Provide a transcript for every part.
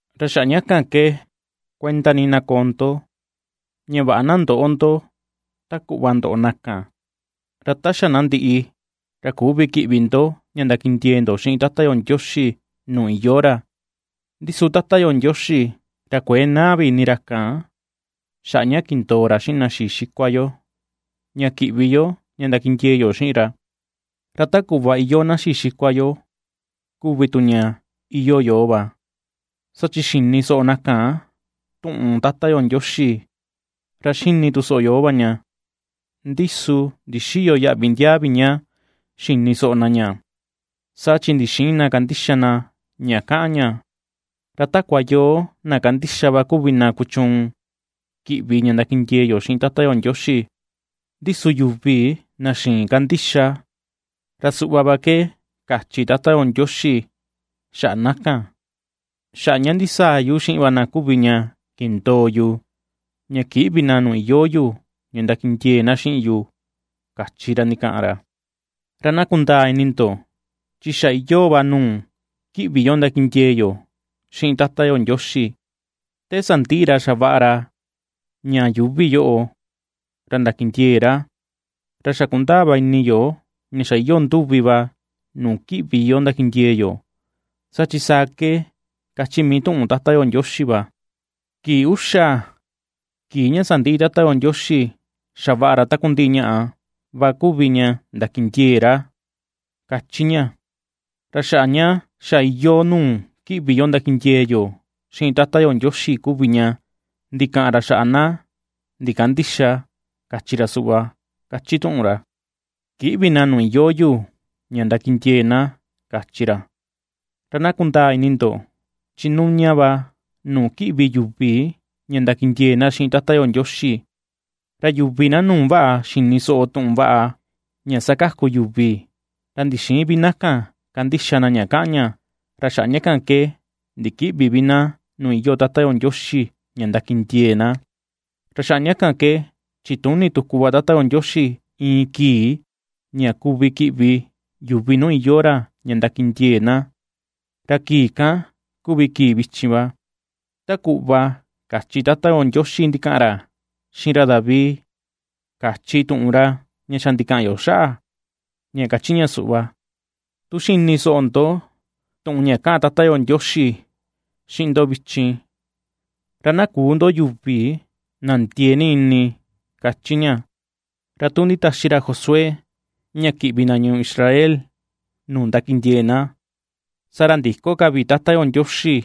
Ra xaꞌa ña kan ke kuenda ni na koo ndo, ña vaꞌa na ndöꞌo ndo ta kuꞌva ndoꞌo na kan, ra ta xa na ndiꞌi, ra küvi kiꞌvi ndo ña ndakindiee ndo xiꞌin Tata yo Ndioxi nuu iyoo ra, ndi su Tata yo Ndioxi ra kuëe naa vi ini ra kan xaꞌa ña kindoo ra xiꞌin na xii xikua yo ña kiꞌvi yo ña ndakindiee yo xiꞌin ra. Ra ta kuꞌva iyoo na xii xikua yo kuvi tu ña iyoo yoo va, saa chi xini soꞌo na kan tuꞌun Tata yo Ndioxi ra xini tu soꞌo yoo va ña, ndi su ndixïyo yaꞌvi ndiaa vi ña xini soꞌo na ña, saa chi ndixïin na kandixa na ña kaꞌan ña. Ra takua yoo na kandixa va kuvi na kuchuun kiꞌvi ña ndakindiee yo xiꞌin Tata yo Ndioxi. Ndi su yuvi na xïin kandixa, ra suꞌva va ke kachi Tata yo Ndioxi xaꞌa na kan: Xaꞌa ña ndisaa yu xiꞌin va na kuvi ña kindoo yu, ña kïꞌvi na nuu iyoo yu ña ndakindiee na xiꞌin yu, kachi ra ndikaꞌan ra. Ra na kundaa ini ndo chi xa iyoo va nuu kiꞌvi yo ndakindiee yo xiꞌin Tata yo Ndioxi, te sandiꞌi ra xavaꞌa ra ña yuuvi yoꞌo, ra ndakindiee ra. Ra xa kundaa va ini yo ña xa iyoo nduvi va nuu kiꞌvi yo ndakindiee yo, saa chi saa ke kachi mii tuꞌun Tata yo Ndioxi va: Kii uxa, kii ña sandiꞌi Tata yo Ndioxi xavaꞌa ra takundiꞌi ñaꞌa va kuvi ña ndakindiee ra, kachi ña. Ra xaꞌa ña xa iyoo nuu kiꞌvi yo ndakindiee yo xiꞌin Tata yo Ndioxi kuvi ña ndikaꞌan ra xaꞌa na ndikandïxa, kachi ra suꞌva, kachi tuꞌun ra: Kïꞌvi na nuu iyoo yu ña ndakindiee na, kachi ra. Ra na kundaa ini ndo, chi nuña va nuu kiꞌvi yuvi ña ndakindiee na xiꞌin Tata yo Ndioxi; ra yuvi na nuu vaꞌa xini soꞌo tuꞌun vaꞌa ña ^sakaku yuvi, ra ndixïin vi na kan kandixa na ña kaꞌan ña, ra xaꞌa ña kan ke ndikïꞌvi vi na nuu iyoo Tata yo Ndioxi ña ndakindiee na. Ra xaꞌa ña kan ke chituni tuku va Tata yo Ndioxi iin kii ña kuvi kiꞌvi yuvi nuu iyoo ra ña ndakindiee na, ra kii kan kuvi kii vichin va. Ta kuꞌva kachi Tata yo Ndioxi ndikaꞌan ra xiꞌin ra David kachi tuꞌun ra ña xa ndikaꞌan yo xaꞌa, ña ^kachi suꞌva: Tu xini soꞌo ndo tuꞌun ña kaꞌan Tata yo Ndioxi xiꞌin ndo vichin, ra na küu ndo yuvi na ndiee ni ini, ^kachi ña. Ra tu nditaxi ra Josué ña kiꞌvi na ñuu Israel nuu ndakindiee na, saa ra ndïko ka vi Tata yo Ndioxi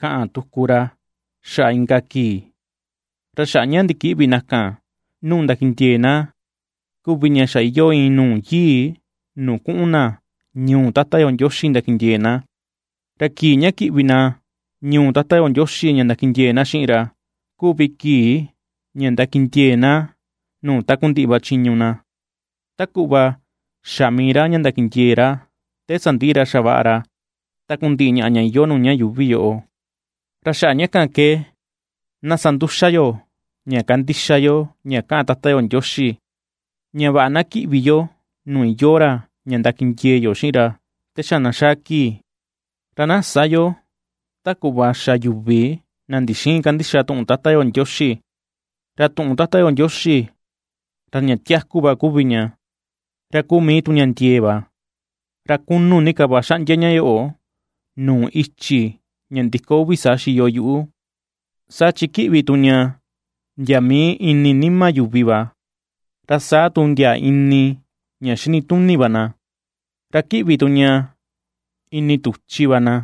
kaꞌan tuku ra xaꞌa inka kii. Ra xaꞌa ña ndikïꞌvi na kan nuu ndakindiee na kuvi ña xa iyoo iin nuu yii nuu kuꞌun na ñuu Tata yo Ndioxi ndakindiee na. Ra kii ña kiꞌvi na ñuu Tata yo Ndioxi ña ndakindiee na xiꞌin ra, kuvi kii ña ndakindiee na nuu takundiꞌi va chiñu na, ta kuꞌva xa mii ra ña ndakindiee ra te sandiꞌi ra xavaꞌa ra takundiꞌi ñaꞌa ña iyoo nuu ña yuuvi yoꞌo. Ra xaꞌa ña kan ke na sa nduxa yo ña kandixa yo ña kaꞌan Tata yo Ndioxi, ña vaꞌa na kiꞌvi yo nuu iyoo ra ña ndakindiee yo xiꞌin ra te xa na xaa kii. Ra na sä yo ta kuꞌva xa yuvi na ndixïin kandixa tuꞌun Tata yo Ndioxi. Ra tuꞌun Tata yo Ndioxi, ra ña tiaku va kuvi ña, ra kuu mii tu ña ndiee va. Ra kunu ni ka va xaꞌndia ña yoꞌo, nuu ichi ña ndiko uvi saa xiyo yuꞌu, saa chi kiꞌvi tu ña ndia mii ini nima yuvi va, ra saa tu ndia ini ña xinituni va na; ra kiꞌvi tu ña ini tuchi va na,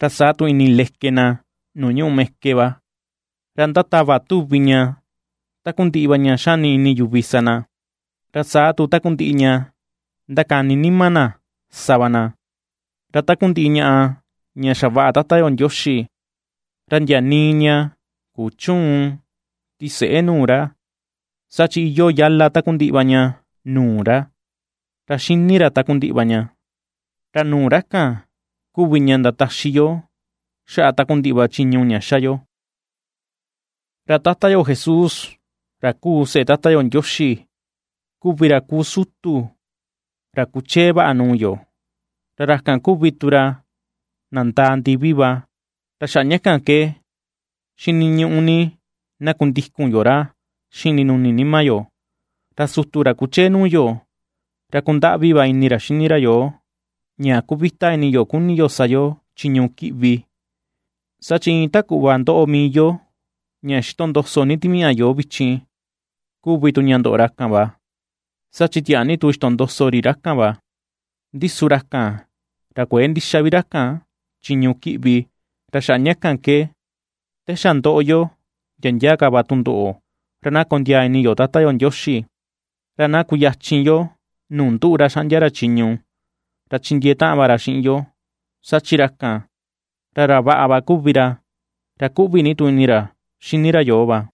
ra saa tu ini leke na nuu ñuꞌu meke va. Ra ndatava tuvi ña takundiꞌi va ña xani ini yuvi sa na, ra saa tu takundiꞌi ña ndakani nima na sa va na. Ra takundiꞌi ñaꞌa ña xavaꞌa Tata yo Ndioxi, ra ndia nii ña kuchüun tiseꞌe nuu ra; saa chi iyoo yala takundiꞌi va ña nuu ra, ra xini ra takundiꞌi va ña. Ra nuu ra kan kuvi ña ndataxi yo xaꞌa takundiꞌi va chiñu ña xa yo. Ra Tata yo Jesús, ra kuu seꞌe Tata yo Ndioxi kuvi ra kuu sutu ra kuchee vaꞌa nuu yo, ra ra kan kuvi tu ra nandaa ndivi va, ra xaꞌa ña kan ke xiniñuꞌu ni, na kundikun yo ra xiꞌin ndinuni nima yo. Ra sutu ra kuchee nuu yo, ra ^kundaꞌvi va ini ra xini ra yoo ña kuvita ini yo kuni yo sa yo chiñu kiꞌvi, saa chi iin ta kuꞌva ndoꞌo mii yo ña xitondoso ni timiaꞌa yoo vichin kuvi tu ña ndoꞌo ra kan va, saa chi tiaa ni tu xitondoso ri ra kan va, ndi su ra kan, ra kuëe ndixa vi ra kan chiñu kiꞌvi. Ra xaꞌa ña kan ke, te xa ndoꞌo yo ndia ndia ka va tundoꞌo, ra na kondiaa ini yo Tata yo Ndioxi, ra na kuyachin yo nuu nduꞌu ra xaꞌndia ra chiñu. Ra chindiee taꞌan va ra xiꞌin yo, saa chi ra kan, ra ra vaꞌa va kuvi ra, ra kuꞌvi ni tu ini ra xini ra yoo va.